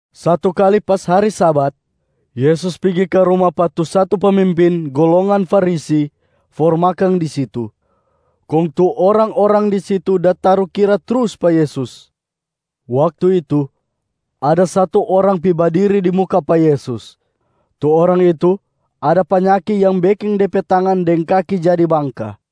Satu kali pas hari Sabat, Yesus pigi ka ruma pa tu satu pemimpin golongan Farisi for makang di situ. Kong tu orang-orang di situ da tarukira trus pa Yesus. Waktu itu, ada satu orang pi badiri di muka pa Yesus. Tu orang itu ada panyaki yang beking de pe tangan deng kaki jadi bangka.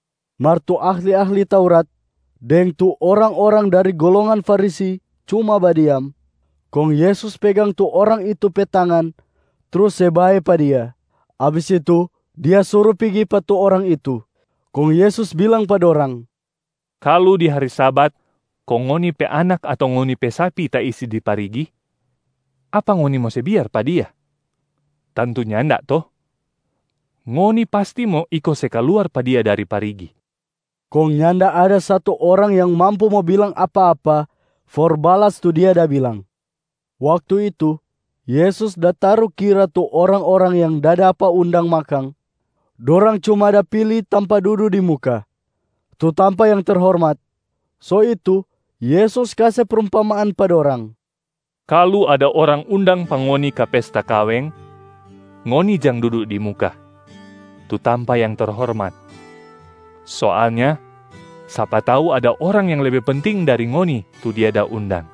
Mar tu ahli-ahli Taurat deng tu orang-orang dari golongan Farisi cuma badiam. Kong Yesus pegang tu orang itu pe tangan trus se bae pa dia. Abis itu Dia suru pigi pa tu orang itu. Kong Yesus bilang pa dorang, “Kalu di hari Sabat kong ngoni pe anak ato ngoni pe sapi taisi di parigi, apa ngoni mo se biar pa dia? Tantu nyanda to? Ngoni pasti mo iko se kaluar pa dia dari parigi.” Kong nyanda ada satu orang yang mampu mo bilang apa-apa for balas tu Dia da bilang. Waktu itu, Yesus da tarukira tu orang-orang yang da dapa undang makang, dorang cuma da pili tampa dudu di muka, tu tampa yang terhormat. So itu Yesus kase prumpamaan pa dorang, “Kalu ada orang undang pa ngoni ka pesta kaweng, ngoni jang dudu di muka, tu tampa yang terhormat. Soalnya sapa tau ada orang yang lebe penting dari ngoni tu dia da undang,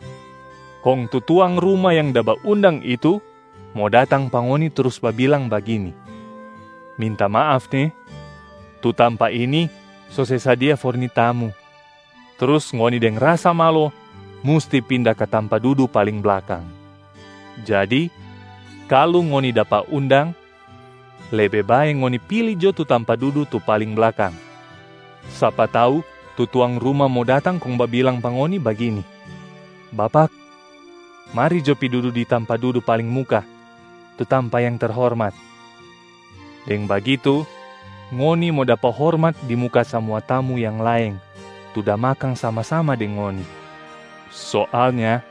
kong tu tuang ruma yang da baundang itu mo datang pa ngoni trus babilang bagini, ‘Minta maaf ne, tu tampa ini so se sadia for ni tamu.’ Trus ngoni deng rasa malo musti pinda ka tampa dudu paling blakang. Jadi kalu ngoni dapa undang, lebe bae ngoni pili jo tampa dudu tu paling blakang. Sapa tau tu tuang ruma mo datang kong babilang pa ngoni bagini, ‘Bapak, mari jo pi dudu di tampa dudu paling muka, tu tampa yang terhormat.’ Deng bagitu ngoni mo dapa hormat di muka samua tamu yang laeng tu da makang sama-sama deng ngoni. Soalnya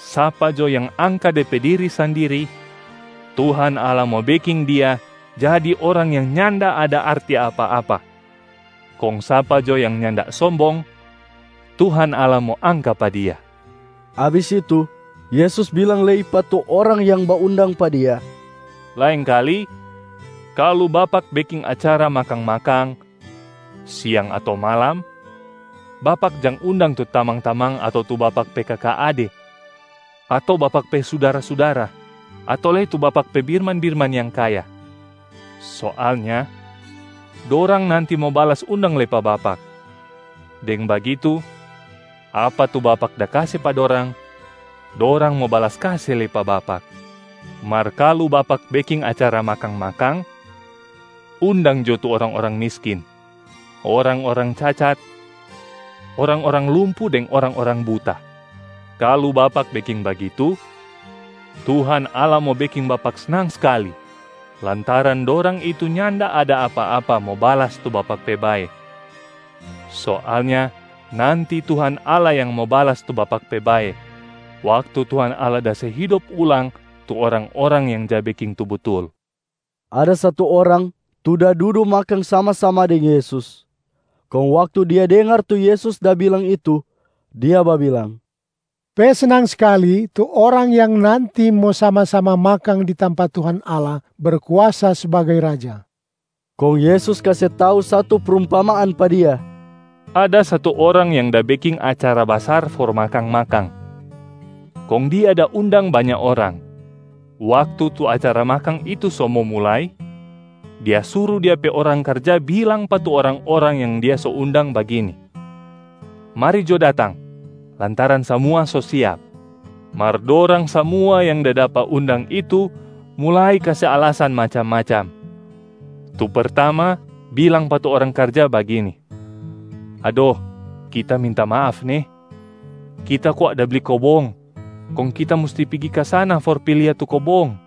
sapa jo yang angka de pe diri sandiri, Tuhan Allah mo beking dia jadi orang yang nyanda ada arti apa-apa. Kong sapa jo yang nyanda sombong, Tuhan Allah mo angka pa dia.” Abis itu, Yesus bilang lei pa tu orang yang baundang pa Dia, “Laengkali kalu bapak beking acara makang-makang, siang ato malam, bapak jang undang tu tamang-tamang ato tu bapak pe kaka ade ato bapak pe sudara-sudara ato lei tu bapak pe birman-birman yang kaya. Soalnya dorang nanti mo balas undang lei pa bapak. Deng bagitu, apa tu bapak da kase pa dorang, dorang mo balas kase lei pa bapak. Mar kalu bapak beking acara makang-makang, undang jo tu orang-orang miskin, orang-orang cacat, orang-orang lumpu deng orang-orang buta. Kalu bapak beking bagitu, Tuhan Allah mo beking bapak snang skali lantaran dorang itu nyanda ada apa-apa mo balas tu bapak pe bae. Soalnya nanti Tuhan Allah yang mo balas tu bapak pe bae waktu Tuhan Allah da se hidop ulang tu orang-orang yang ja beking tu butul.” Ada satu orang tu da dudu makang sama-sama deng Yesus. Kong waktu dia dengar tu Yesus da bilang itu, dia babilang, “Pe snang skali tu orang yang nanti mo sama-sama makang di tampa Tuhan Allah Berkuasa sbagai Raja.” Kong Yesus kase tau satu prumpamaan pa dia, “Ada satu orang yang da beking acara basar for makang-makang, kong dia da undang banya orang. Waktu tu acara makang itu so mo mulai, dia suru dia pe orang karja bilang pa tu orang-orang yang dia so undang bagini, ‘Mari jo datang, lantaran samua so siap!’ Mar dorang samua yang da dapa undang itu mulai kase alasan macam-macam. Tu pertama bilang pa tu orang karja bagini, ‘Ado, kita minta maaf ne. Kita kwa da bli kobong kong kita musti pigi ka sana for pi lia tu kobong.’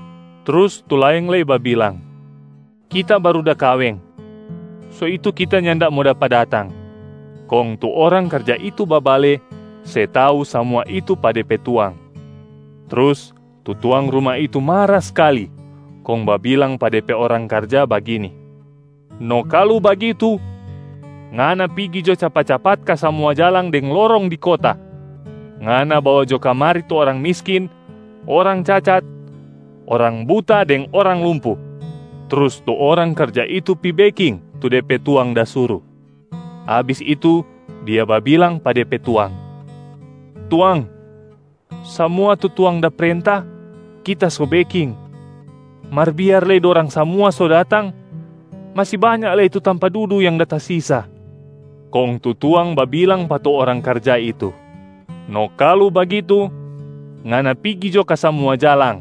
Trus tu laeng lei babilang, ‘Kita baru da kaweng, so itu kita nyanda mo dapa datang.’ Kong tu orang karja itu babale se tau samua itu pa de pe tuang. Trus tu tuang ruma itu mara skali kong babilang pa de pe orang karja bagini, ‘No kalu bagitu, ngana pigi jo capat-capat ka samua jalang deng lorong di kota. Ngana bawa jo kamari tu orang miskin, orang cacat, orang buta deng orang lumpu.’ Trus tu orang karja itu pi beking tu de pe tuang da suru, abis itu dia babilang pa de pe tuang, ‘Tuang, samua tu tuang da prenta, kita so beking. Mar biar lei dorang samua so datang, masi banya lei tu tampa dudu yang da tasisa.’ Kong tu tuang babilang pa tu orang karja itu, ‘No kalu bagitu, ngana pigi jo ka samua jalang,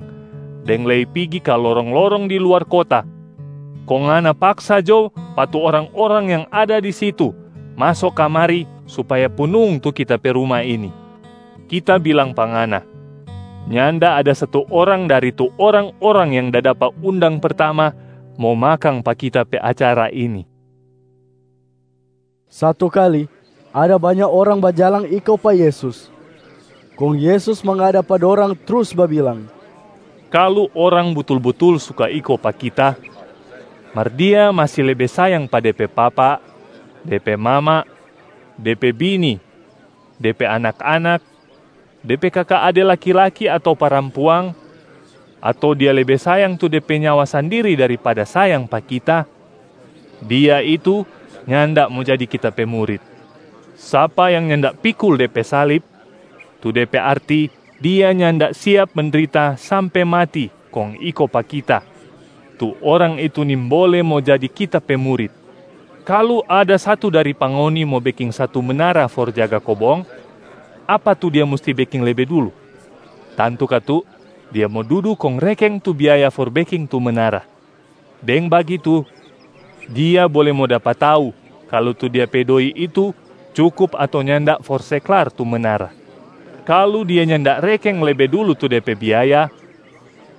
deng lei pigi ka lorong-lorong di luar kota, kong ngana paksa jo pa tu orang-orang yang ada di situ maso kamari supaya punung tu kita pe ruma ini.’ Kita bilang pa ngana, nyanda ada satu orang dari tu orang-orang yang da dapa undang pertama mo makang pa Kita pe acara ini.” Satu kali, ada banya orang bajalang iko pa Yesus. Kong Yesus mangada pa dorang trus babilang, “Kalu orang butul-butul suka iko pa Kita, mar dia masi lebe sayang pa de pe papa, de pe mama, de pe bini, de pe anak-anak, de pe kaka ade laki-laki ato parampuang, ato dia lebe sayang tu de pe nyawa sandiri daripada sayang pa Kita, dia itu nyanda mo jadi Kita pe murit. Sapa yang nyanda pikul de pe salib, tu de pe arti dia nyanda siap mendrita sampe mati kong iko pa Kita, tu orang itu nimbole mo jadi Kita pe murit. Kalu ada satu dari pa ngoni mo beking satu menara for jaga kobong, apa tu dia musti beking lebe dulu? Tantu katu dia mo dudu kong rekeng tu biaya for beking tu menara. Deng bagitu, dia bole mo dapa tau kalu tu dia pe doi itu cukup ato nyanda for se klar tu menara. Kalu dia nyanda rekeng lebe dulu tu de pe biaya,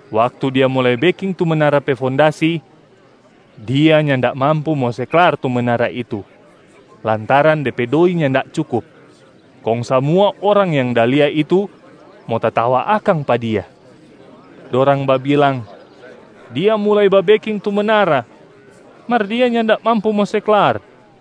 waktu dia mulai beking tu menara pe fondasi, dia nyanda mampu mo se klar tu menara itu lantaran de pe doi nyanda cukup. Kong samua orang yang da lia itu mo tatawa akang pa dia. Dorang babilang, ‘Dia mulai babeking tu menara, mar dia nyanda mampu mo se klar.’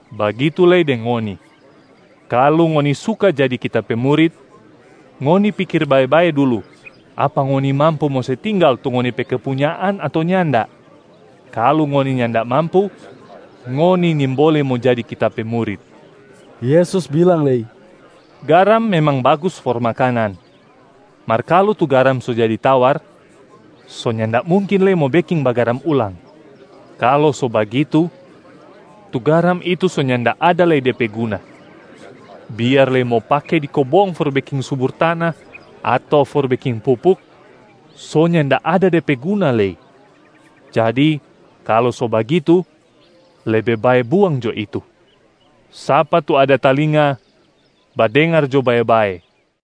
Bagitu lei deng ngoni. Kalu ngoni suka jadi Kita pe murit, ngoni pikir bae-bae dulu apa ngoni mampu mo se tinggal tu ngoni pe kepunyaan ato nyanda. Kalu ngoni nyanda mampu, ngoni nimbole mo jadi Kita pe murit.” Yesus bilang lei, “Garam memang bagus for makanan, mar kalu tu garam so jadi tawar, so nyanda mungkin lei mo beking bagaram ulang. Kalu so bagitu, tu garam itu so nyanda ada lei de pe guna. Biar lei mo pake di kobong for beking subur tana ato for beking pupuk, so nyanda ada de pe guna lei. Jadi kalu so bagitu, lebe bae buang jo itu. Sapa tu ada talinga, badengar jo bae-bae!”